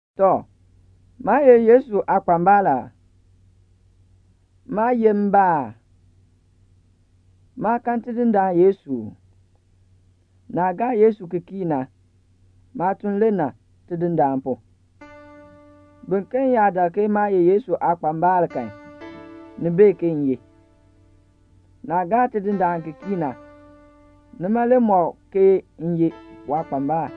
Tɔ, maa ye Yesu aakpambal aa? Maa yeh mbaa aa? Maa kan Tidindaan Yesu uu? Naah gaa Yesu ki kii na, maatuln le na Tidindaan pu. Biken yaa dak ke maa ye Yesu aakpambal kan, ni bee ke m ye. Naah gaa Tidindaan ki kii na, nima le mɔk ke m ye waakpambal.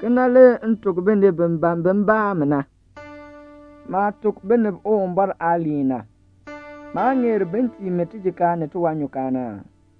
Kena le m tuk binib bi ban bin baa mi na. Maah tuk binib Uwumbɔr aaliin na, maa ŋeer bin tii mi tijikaar ni tiwanyukaan aa?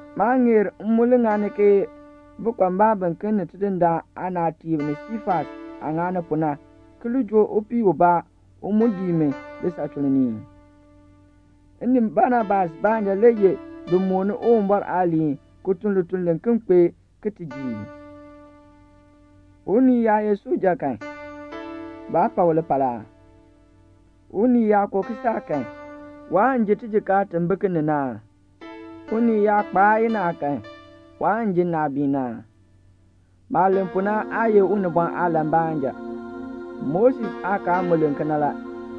Maa ŋeer m mu ŋani ke bikpambalb biken ni Tidindaan aanaatiib ni Siifas aah ŋani pu na, ki joo upii ubaa u mu dii mi lisachuln ni ii? M ni Banabas baanja le ye bin mooni Uwumbɔr aaliin ki tun lituln liken kpee ke ti ji ii? Unii yaa ye suja kan, baa pa u lipal aa? Unii yaa ko kisaak kan, waan ji tijikaar ti bi ki ni na aa? Unii yaa kpaa inaa kan, waan ji nnaabiin aa? Maah len pu na aa ye unibɔn aalan baanja. Moses aakaal mu len kena la.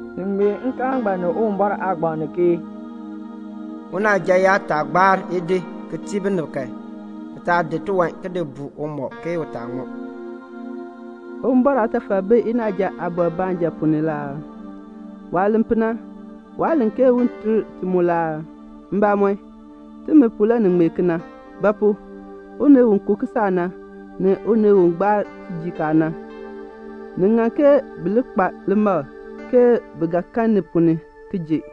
Ni ŋmee nkaal ngbaan ni Uwumbɔr aagbaŋ ni ke "Unaaja yaa taa gbaar idi ki tii binib kan, bi taa di tiwan ki di buu umɔb ke u taa ŋmɔ." Uwumbɔr aatafal bi inaaja aabɔr baanja ponn ni la aa? Waah len pu na, waa len ke un ter ti mu la aa? Mbamɔn, timi pu le ni ŋmee kena. Ba pu? unii u ko kisaak na, ni unii u gbaar tijikaar na, ni ŋan ke bi li kpa limakl ke bi ga kan ni ponn ni ki ji.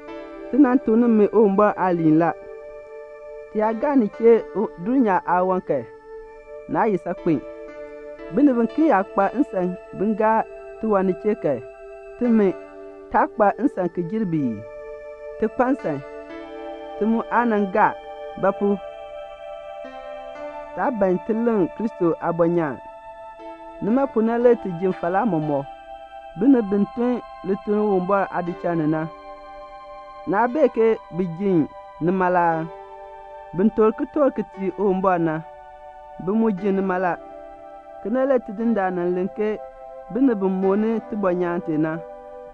Ti nan tuk nimi Uwumbɔr aaliin la. Ti yaa gaa ni chee dulnyaa aawan kan, naa ye saakpen. Binib biken yaa kpa nsan bin gaa tiwan ni chee kan, timi, taa kpa nsan ki jer bi ii? Ti kpa nsan, ti mu aa nan gaa; ba pu? taa ban ti leŋ Kristo aabɔnyaan. Nima pu na le ti ji falaa mɔmɔk. Binib bi tun lituln Uwumbɔr aadichal ni na, naa bee ke bi ji nima la aa? Bin toor kitork ki tii Uwumbɔr na, bi mu ji nima la. Kena le Tidindaan nan len ke binib bi mooni tibɔnyaan tee na,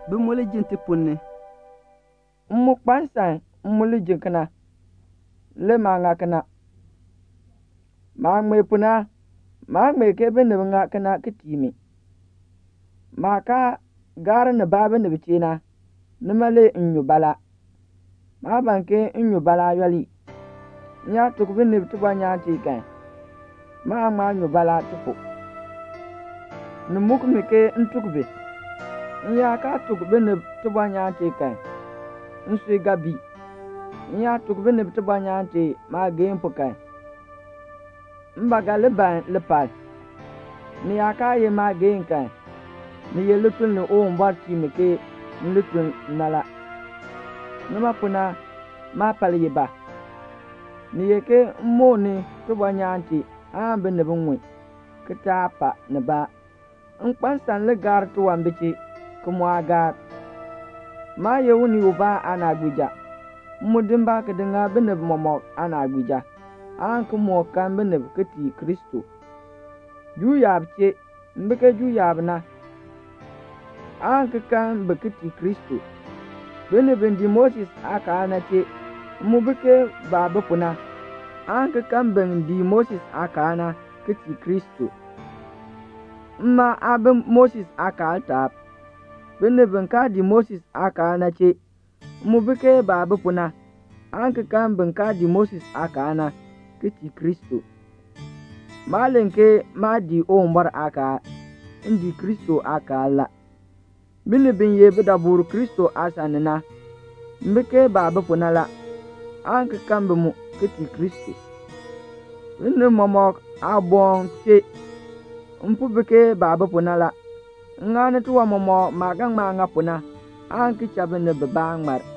bi mu li ji ti ponn ni. M mu kpa nsan m mu li ji kena; le maa ŋa kena. Maah ŋmee pu na, maa ŋmee ke binib ŋa kena ki tii mi. Maah kaa gaar nibaa binib chee na, nima le m nyu baalaa. Maa ban ke m nyu baalaa yooli. M yaa tuk binib tibɔnyaan tee kan, maan ŋma nyu baalaa ti pu. Ni muk mi ke m tuk bi. M yaa kaa tuk binib tibɔnyaan tee kan, nsui ga bii. M yaa tuk binib tibɔnyaan tee maageehn pu kan, m ba ga li ban lipal. Ni yaa kaa ye maageehn kan, ni ye lituln li Uwumbɔr tii mi ke m li tun na la. Nima pu na, maapal ye ba? Ni ye ke m mooni tibɔnyaan tee aan binib ŋun, ki taa pa nibaa. M kpa nsan m li gaar tiwan bi chee, ki mu aa gaar. Maa ye unii ubaa aanaagbiija. M mu di mbaa ki di ŋa binib mɔmɔk aanaagbiija, aan ki moo kan binib ki tii Kristo. Juu yaab chee, m bi ke Juu yaab na, aan ki kan bi ki tii Kristo. Binib bi dii Moses aakaal na chee, m mu bi ke baah bi pu na, aan ki kan bin dii Moses aakaal na, ki tii Kristo. Mma aa bi Moses aakaal taab. Binib bi kaa dii Moses aakaal na chee, m mu bi ke baah bi pu na, aan ki kan bin kaa dii Moses aakaal na, ki tii Kristo. Maa len ke maa dii Uwumbɔr aakaal. M dii Kristo aakaal la. Binib bi ye bidaburb Kristo aasan ni na, m bi ke baah bi pu na la, aan ki kan bi mu, ki tii Kristo. Binib mɔmɔk aaboŋ chee, m po bi ke baah bi pu na la. M ŋani tiwan mɔmɔk maah ga ŋma ŋa pu na, aan ki cha binib bibaa ŋmar.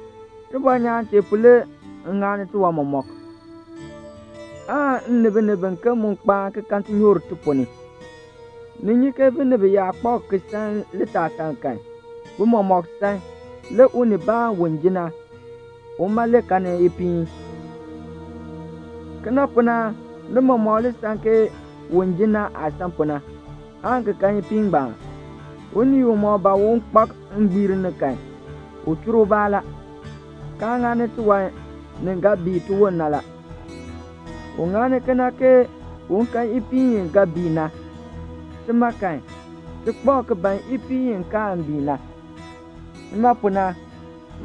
Tibɔnyaan tee pu le m ŋani tiwan mɔmɔk, aan m ni binib biken mu kpaan ki kan tinyoor ti ponn ni. Ni nyi ke binib yaa kpak ki san litaasaln kan, bi mɔmɔk san; le unibaan u ji na, uma le kanni ipiin. Kena pu na ni mɔmɔk li san ke un ji na aah san pu na, aan ki kan ipiin ngbaan. Unii umɔk ban un kpak ngbiir ni kan, u chur ubaa la, kaa ŋani tiwan ni ga bii tiwon na la. U ŋani kena ke un kan ipiin i ga bii na. Tima kan, ti kpak ki ban ipiin i kaan bii na. Nima pu na,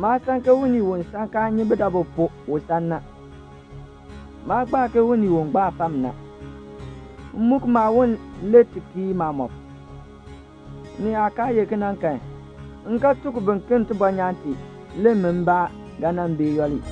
maa san ke unii u san kaa nyi budabu pu u san na. Maa gbaa ke unii u gbaa fam na; m muk maawon le ti kii maamɔb. Ni yaa kaa ye kena kan, m ga tuk biken tibɔnyaan tee, le min mbaa ga nan bee yooli.